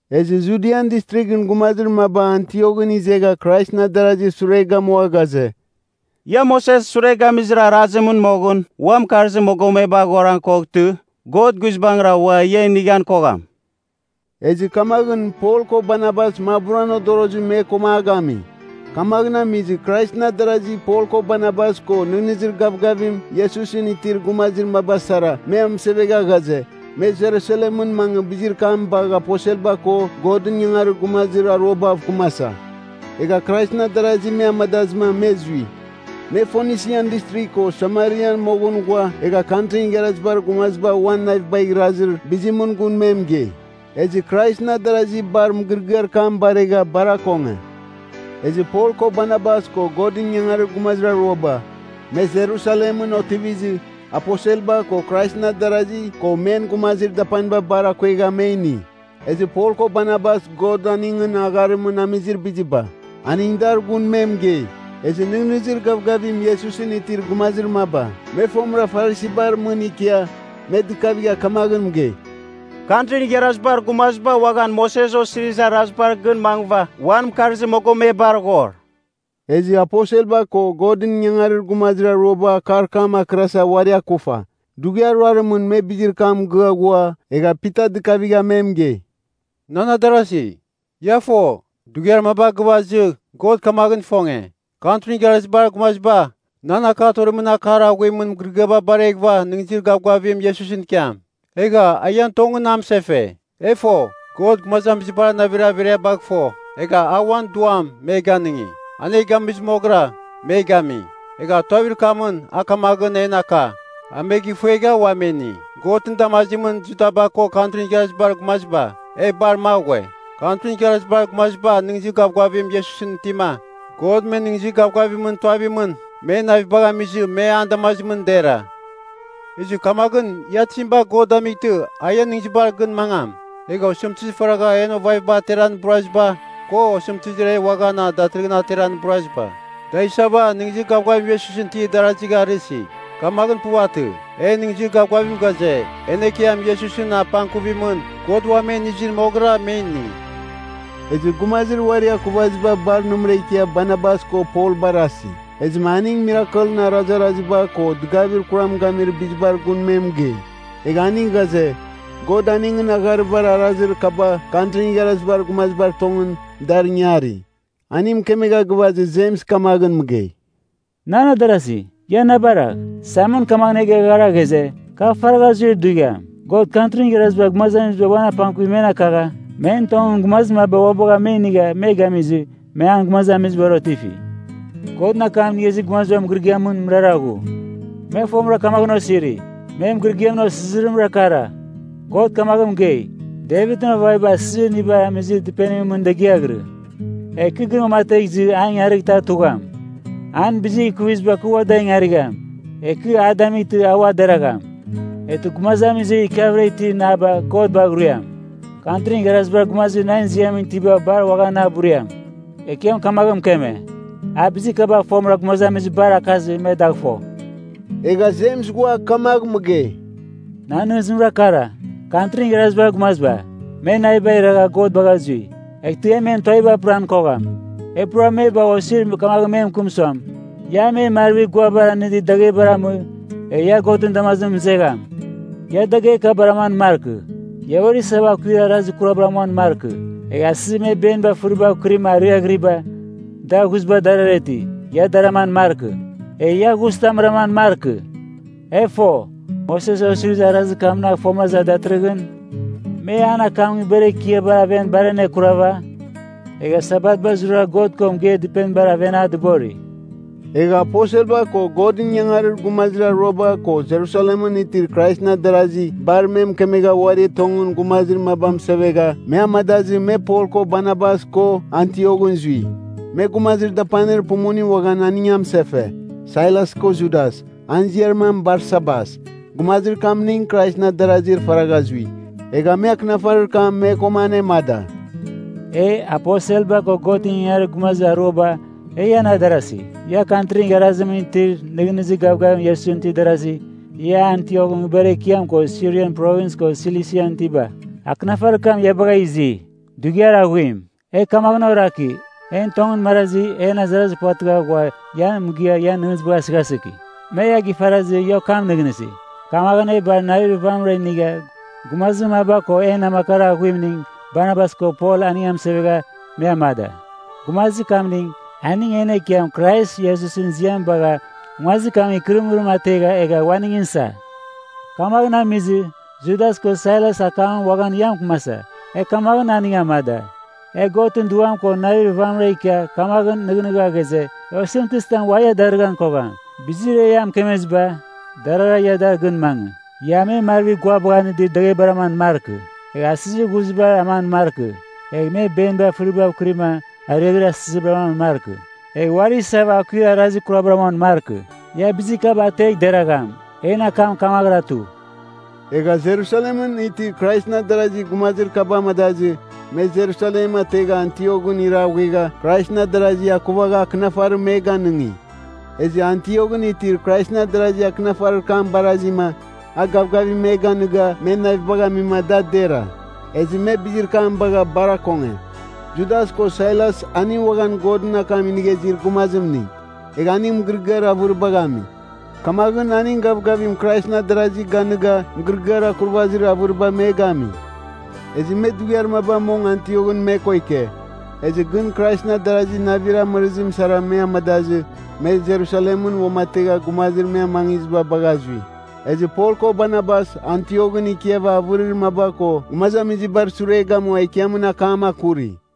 Ezɨ Judian Distrighɨn gumazir maba Antioghɨn izegha Kraisɨn adarazir sure gamua ghaze, “Ia Moses sure gamizir arazimɨn moghɨn ua mɨkarzir mogomeba aghoran koghtɨ, God guizbangɨra ua ia inighan kogham.” Ezɨ kamaghɨn Pol ko Barnabas maburan odorozim me koma a gami. Kamaghɨn amizɨ Kraisɨn adarasi Pol ko Barnabas ko nɨghnɨzir gavgavim Iesusɨn itir gumazir maba sara me amɨsevegha ghaze, me Jerusalemɨn mangɨ bizir kam bagh aposelba ko Godɨn ingangarir gumazir aruabav kɨmasa. Egha Kraisɨn adarasi me amadazɨma me zui. Me Fonisian Distrigh ko Samarian moghɨn ghua egha Kantrin Igharazibar Gumaziba uan navibagh irazir bizimɨn gun me mɨgei. Ezɨ Kraisɨn adarasi bar mɨgɨrɨgɨar kam baregha bar akonge. Ezɨ Pol ko Barnabas ko Godɨn ingangarir gumazir aruaba, me Jerusalemɨn otivizɨ, aposelba ko Kraisɨn adarazi ko men gumazir dapaniba bar akuegha me ini. Ezɨ Pol ko Barnabas God aningɨn agharimɨn amizir biziba. aning dar gun me mɨgei. Ezɨ nɨghnɨzir gavgavim Iesusɨn itir gumazir maba, me fomɨra Farisibar mɨn ikia, me dɨkavigha kamaghɨn mɨgei, “Kantrin Igharazibar Gumaziba uaghan Moses Osirizir Arazibar gɨn mangɨva uan mɨkarzir mogomebar aghor.” Ezɨ aposelba ko Godɨn ingangarir gumazir aruaba akar kam akɨrasa uari akufa. Dughiar ruarimɨn me bizir kam mɨgɨa ghua, egha Pita dɨkavigha me mɨgei, “Nan adarasi, ia fo dughiar maba gɨvazɨ God kamaghɨn ifonge, Kantrin Igharazibar Gumaziba nan akar torimɨn akar aghuimɨn mɨgɨrɨgɨam bareghɨva nɨghnɨzir gavgavim Iesusɨn ikiam. Egha a ian tongɨn na mɨsefe. E fo, God gumazamizibar navir averiabagh fo. Egha a uan Duam me ganɨngi. An e gamizɨ moghɨra, me gami. Egha tuavir kamɨn a kamaghɨn en aka, a me gifuegha ua me ini. Godɨn damazimɨn Judaba ko Kantrin Igharazibar Gumaziba, e bar magh ghue. Kantrin Igharazibar Gumaziba nɨghnɨzir gavgavim Iesusɨn itima, God men nɨghnɨzir gavgavimɨn tuavimɨn, men navibagh amizɨ me an damazimɨn dera Ezɨ kamaghɨn ia tizim bagh God damightɨ, a ian nɨghnɨzibar gɨn mangam? Egha osɨmtɨzir faragha en ovaviba ateran iburaziba ko osɨmtɨzir e uaghan datɨrɨghɨn ateran iburaziba, da isava nɨghnɨzir gavgavim Iesusɨn itir darazigh arɨsi. Kamaghɨn puvatɨ. En nɨghnɨzir gavgavim ghaze, en Ekiam Iesusɨn apangkuvimɨn, God uam e inizir moghɨra me ini.” Ezɨ gumazir uari akuvaziba bar nɨmɨra ikia Barnabas ko Pol barasi. Ezɨma aning mirakelɨn arazaraziba ko dɨgavir kuram gamir bizibar gun me mɨgei. Egha aning ghaze, God aningɨn agharibar arazir kaba Kantrin Igharazibar Gumazibar tongɨn, dar ingari. Aning mɨkemegha gɨvazɨ Jems kamaghɨn mɨgei, “Nan adarasi, ia na baragh. Saimon kamaghɨn e geghara ghaze, kar faragha zuir dughiam, God Kantrin Igharazibar Gumaziba uan apangkuvim men akagha, men tongɨn gumazir maba ua bagha me inigha me gamizɨ, me an gumazamizibar otifi. Godɨn akam inigha izir gumazibar mɨgɨrɨgɨamɨn mɨrara ghu. Me fomɨra kamaghɨn osiri, men mɨgɨrɨgɨamɨn osizirimra kara, ‘God kamaghɨn mɨgei, Devitɨn ovaviba asizir inibar amizir dɨpenimɨn mɨn degiaghɨrɨ. Egh kɨ gɨn uamategh izɨ, an ingarightɨ a tugham. An bizir ikuviziba kɨ ua dar ingarigham, egh kɨ a damightɨ a ua deragham. Eghtɨ gumazamizir ikiavɨra itir naba God bagh ruiam. Kantrin Igharazibar Gumazir nan ziamɨn itiba bar uaghan na buriam. Ekiam kamaghɨn mɨkeme. A bizir kaba fomɨra gumazamizibar akazɨ me dagh fo.’” Egha Jems ghua kamagh mɨgei, “Nan nɨghnɨzimra kara, Kantrin Igharazibar Gumaziba, me navibagh iragha God bagha zui. Eghtɨ e men tuaviba apɨran kogham. E pura me bagh osir kamagh me mɨkɨm suam, ia me marvir guabagh anɨdir daghebar amɨ, egh ia Godɨn damazimɨn mɨzegham. Ia dagher kabar aman markɨ. Ia uari isava akuir arazir kurabar amuan markɨ. Egha asɨzir me benibar fɨribav kɨrima ariaghɨriba, dar ghuziba darara iti. Ia dar aman markɨ. Egh ia ghuzitam raman markɨ. E fo, Moses osirizir arazir kamnagh fomɨra iza datɨrɨghɨn, me an akam nguibar ekiabar aven bar anekurava, egha Sabatba zurara God ko mɨgeir dɨpenibar aven a dɨbori.” Egha aposelba ko Godɨn ingangarir gumazir aruaba ko Jerusalemɨn itir Kraisɨn adarazi bar me mɨkemegha uari tongɨn gumazir maba mɨsevegha me amadazɨ me Pol ko Barnabas ko Antioghɨn zui. Me gumazir dapanir pumuning uaghan aning amɨsefe: Sailas ko Judas, an ziar mam Barsabas. Gumazir kamning Kraisɨn adarazir faragha zui. Egha me akɨnafarir kam me koma anemada: E, aposelba ko Godɨn ingangarir gumazir aruaba, e ian adarasi. Ia Kantrin Igharazimɨn itir nɨghnɨzir gavgavim Iesusɨn itir darazi, ia Antioghɨn nguibar ekiam ko Sirian Provins ko Silisian itiba. Akɨnafarir kam ia bagha izi. Dughiar aghuim. E kamaghɨn oraki, en tongɨn marazi, en azarazir puvatɨgha ghua ia mɨgɨa ian nɨghnɨzibagh asɨghasɨki. Me ia gifarazɨ ia okam nɨghnɨsi. Kamaghɨn e bar navir vamɨra inigha gumazir maba ko en namakar aghuimning Barnabas ko Pol a mɨsevegha me amada. Gumazir kamning, aning en Ekiam Krais Iesusɨn ziam bagha nguazir kamɨn ikɨrɨmɨrim ategha egha uaningɨn sa. Kamaghɨn amizɨ, Judas ko Sailas akamɨn uaghan ia mɨkɨmasa, e kamaghɨn aning amada. E Godɨn Duam ko navir vamɨra ikia kamaghɨn nɨghnɨgha ghaze, e osɨmtɨzitam ua ia darɨghan kogham. Bizir e ia mɨkemeziba, darara ia dar gɨn mangɨ. Ia me marvir guabagh anɨdir daghebar aman markɨ, egh asɨzibar ghuzibar aman markɨ, egh me beniba fɨribav kɨrima ariaghɨrir asizibar aman markɨ, egh uari isava akuir arazir kurabar amuan markɨ. Ia bizir kaba ategh deragham. En akam kamaghɨra tu. Egha Jerusalem itir Kraisɨn Adarasi gumazir kaba amadazɨ, me Jerusalem ategha Antioghɨn iraghuegha Kraisɨn adarazi akuvagha akɨnafarim me ganɨngi. Ezɨ Antioghɨn itir Kraisɨn adarazi akɨnafarir kam barazima, a gavgavim me ganiga men navibagh ami da dera. Ezɨ me bizir kam bagha bar akonge. Judas ko Sailas aning uaghan Godɨn akam inigha izir gumazimning. Egha aning mɨgɨrɨgɨar avɨribagh ami. Kamaghɨn aning gavgavim Kraisɨn adarazi ganɨga mɨgɨrɨgɨar akurvazir avɨriba me gami. Ezɨ me dughiar maba mong Antioghɨn me ko ike. Ezɨ gɨn Kraisɨn adarazi navir amɨrɨzim sara me amadazɨ, me Jerusalemɨn uamategha gumazir me amangiziba bagha zui. Ezɨ Pol ko Barnabas Antioghɨn ikiava avɨrir maba ko gumazamizibar sure gamua Ekiamɨn akam akuri.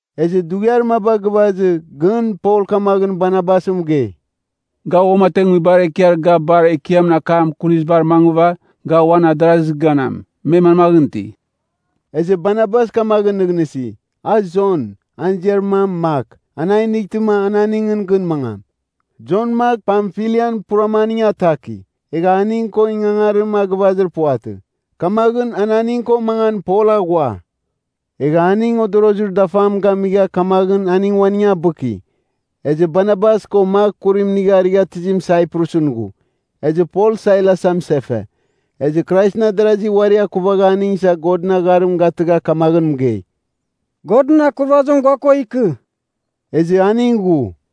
Ezɨ dughiar maba gɨvazɨ gɨn Pol kamaghɨn Barnabas mɨgei, “Ga uamategh nguibar ekiar ga bar Ekiamɨn akam akunizibar mangɨva, ga uan adarazir ganam, me manmaghɨn iti.” Ezɨ Barnabas kamaghɨn nɨghnɨsi, a Jon, an ziar mam Mak, an a inightɨma, a aningɨn gɨn mangam. Jon Mak Pamfilian purama aning ataki, egha aning ko ingangarim a gɨvazir puvatɨ. Kamaghɨn an aning ko mangan Pol aghua. Egha aning odorozir dafam gamigha kamaghɨn aning uaning abɨki. Ezɨ Barnabas ko Mak kurim inigha arighatɨzim Saiprusɨn ghu. Ezɨ Pol Sailas amɨsefe. Ezɨ Kraisɨn adarazi uari akuvagha aning isa Godɨn agharim gatɨgha kamagh mɨgei, “Godɨn akurvazim gua ko ikɨ.” Ezɨ aning ghu.